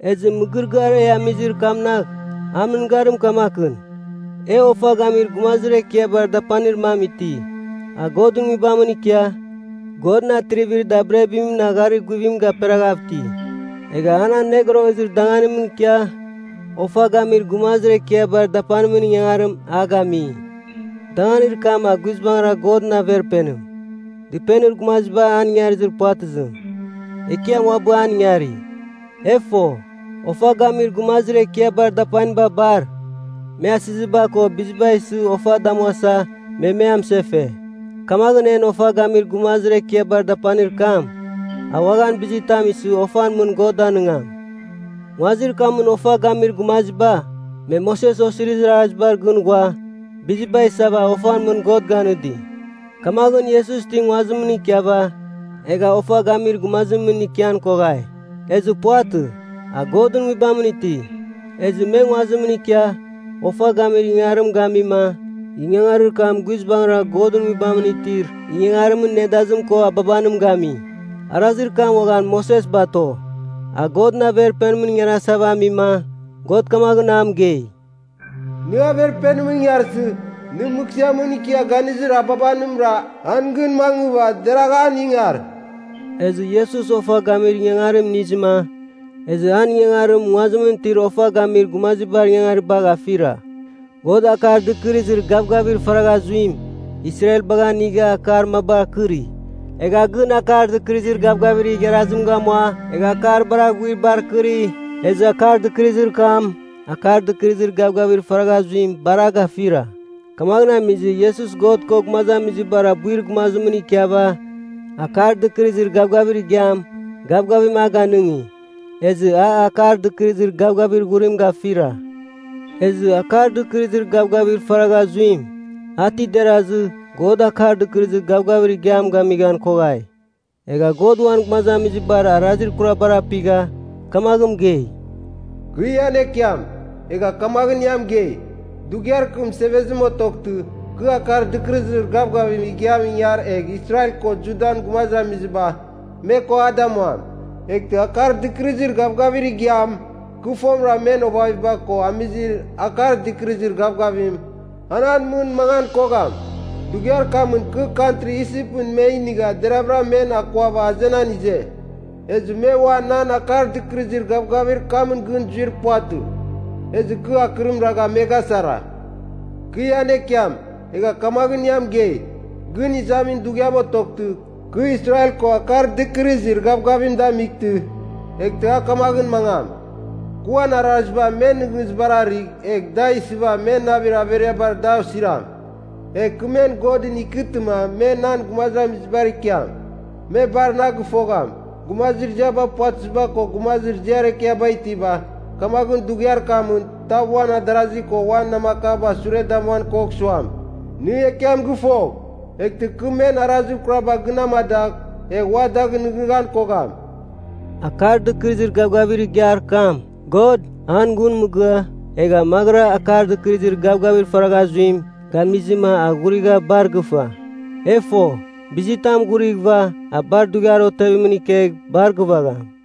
Ezɨ mɨgɨrɨgɨar e amizir kamnagh an mɨngarim kamakɨn, e Ofa Gamir Gumazir Ekiabar Dapanir mam iti, a Godɨn Nguibamɨn ikia Godɨn atrivir dabirabimɨn agharir guvim gaperaghav iti. Egha an Anogorogezir Danganimɨn ikia Ofa Gamir Gumazir Ekiabar Dapanimɨn ingangarim a gami, danganir kam a guizbangɨra Godɨn Averpenim, dɨpenir gumaziba an ingarizir puvatɨzim, Ekiam uabɨ an ingari. E fo, Ofa Gamir Gumazir Ekiabar Dapaniba bar, me asiziba ko biziba isɨ ofa damuasa me me amɨsefe. Kamaghɨn en Ofa Gamir Gumazir Ekiabar Dapanir kam, a uaghan bizitam isɨ ofan mɨn God danɨngam. Nguazir kamɨn ofa gamir gumaziba, me Moses Osirizir Arazibar gɨn ghua biziba isava ofan mɨn God ganɨdi. Kamaghɨn Iesus ti nguazimɨn ikiava egha ofa gamir gumazimɨn ikian koghai. Ezɨ puvatɨ, a Godɨn Nguibamɨn iti. Ezɨ me nguazimɨn ikia ofa gamir ingangarim gamima ingangarir kam guizbangɨra Godɨn Nguibamɨn itir ingangarimɨn nedazim ko ababanim gami. Arazir kam uaghan Moses bato. A Godɨn Averpenimɨn ingarasava amima, God kamaghɨn a mɨgei, “Nɨ Averpenimɨn ingarsɨ, nɨ mɨghsɨamɨn ikia ganizir ababanimra, an gɨn mangɨva deragh an ingar.” Ezɨ Iesus ofa gamir ingangarim inizɨma, ezɨ an ingangarim nguazimɨn itir ofa gamir gumazibar ingangaribagh afira. God, Akar Dɨkɨrɨzir Gavgavir faragha zuim, Israelbagh anigha akar mabar akɨri. Egha gɨn Akar Dɨkɨrɨzir Gavgavir igharazim gamua egha akar bar aghuibar akɨri, ezɨ akar dɨkɨrɨzir kam, Akar Dɨkɨrɨzir Gavgavir faragha zuim bar a gafira. Kamaghɨn amizɨ Iesus God ko gumazamizibar abuir gumazimɨn ikiava Akar Dɨkɨrɨzir Gavgavir Igiam gavgavim a ganɨngi. Ezɨ a Akar Dɨkɨrɨzir Gavgavir Ghurim gafira. Ezɨ Akar Dɨkɨrɨzir Gavgavir faragha zuim, a ti derazɨ God Akar Dɨkɨrɨzir Gavgavir Igiam gamighan koghai. Egha God uan gumazamizibar arazir kuraba apigha kamaghɨn mɨgei, “Kɨ ian Ekiam, egha kamaghɨn ia mɨgei. Dughiar kɨ mɨsevezim otoghtɨ, kɨ Akar Dɨkɨrɨzir Gavgavir Igiamɨn ingar egh Israel ko Judan gumazamiziba, me ko a damuam. Eghtɨ Akar Dɨkɨrɨzir Gavgavir Igiam, kɨ fomɨra men ovaviba ko amizir Akar Dɨkɨrɨzir Gavgavim, an an mɨn mangan kogham. Dughiar kamɨn, kɨ kantri Isipɨn me inigha deravɨra men akuava azenan ize. Ezɨ me ua nan Akar Dɨkɨrɨzir Gavgavir kamɨn gɨn zuir puvatɨ. Ezɨ kɨ akɨrim ragha me gasara. Kɨ ian Ekiam, egha kamaghɨn ia mɨgei, gɨn izamin dughiam otoghtɨ, kɨ Israel ko Akar Dɨkɨrɨzir Gavgavim damightɨ, eghtɨ a kamaghɨn mangam: Kɨ uan araziba men nɨghnɨzibar arɨgh, egh da isɨva men navir averiabar dar osiram. Egh kɨ men Godɨn ikɨtɨma me nan gumazamizibar ikiam. Me bar na gɨfogham, gumazir ziaba puvatɨziba ko gumazir ziar ekiaba itiba. Kamaghɨn dughiar kamɨn, tav uan adarasi ko uan namakaba sure damuan kogh suam, ‘Nɨ Ekiam gɨfogh.’ Eghtɨ kɨ men arazir kuraba gɨn amadagh, egh ua dagh nɨghnɨghan kogham.” Akar Dɨkɨrɨzir Gavgavir Igiar kam, God an gun mɨgɨa egha maghɨra Akar Dɨkɨrɨzir Gavgavir faragha zuim gamizɨma a ghurigha bar gɨfa. E fo, bizitam ghurighɨva a bar dughiar otevimɨn ikegh bar gɨvagham.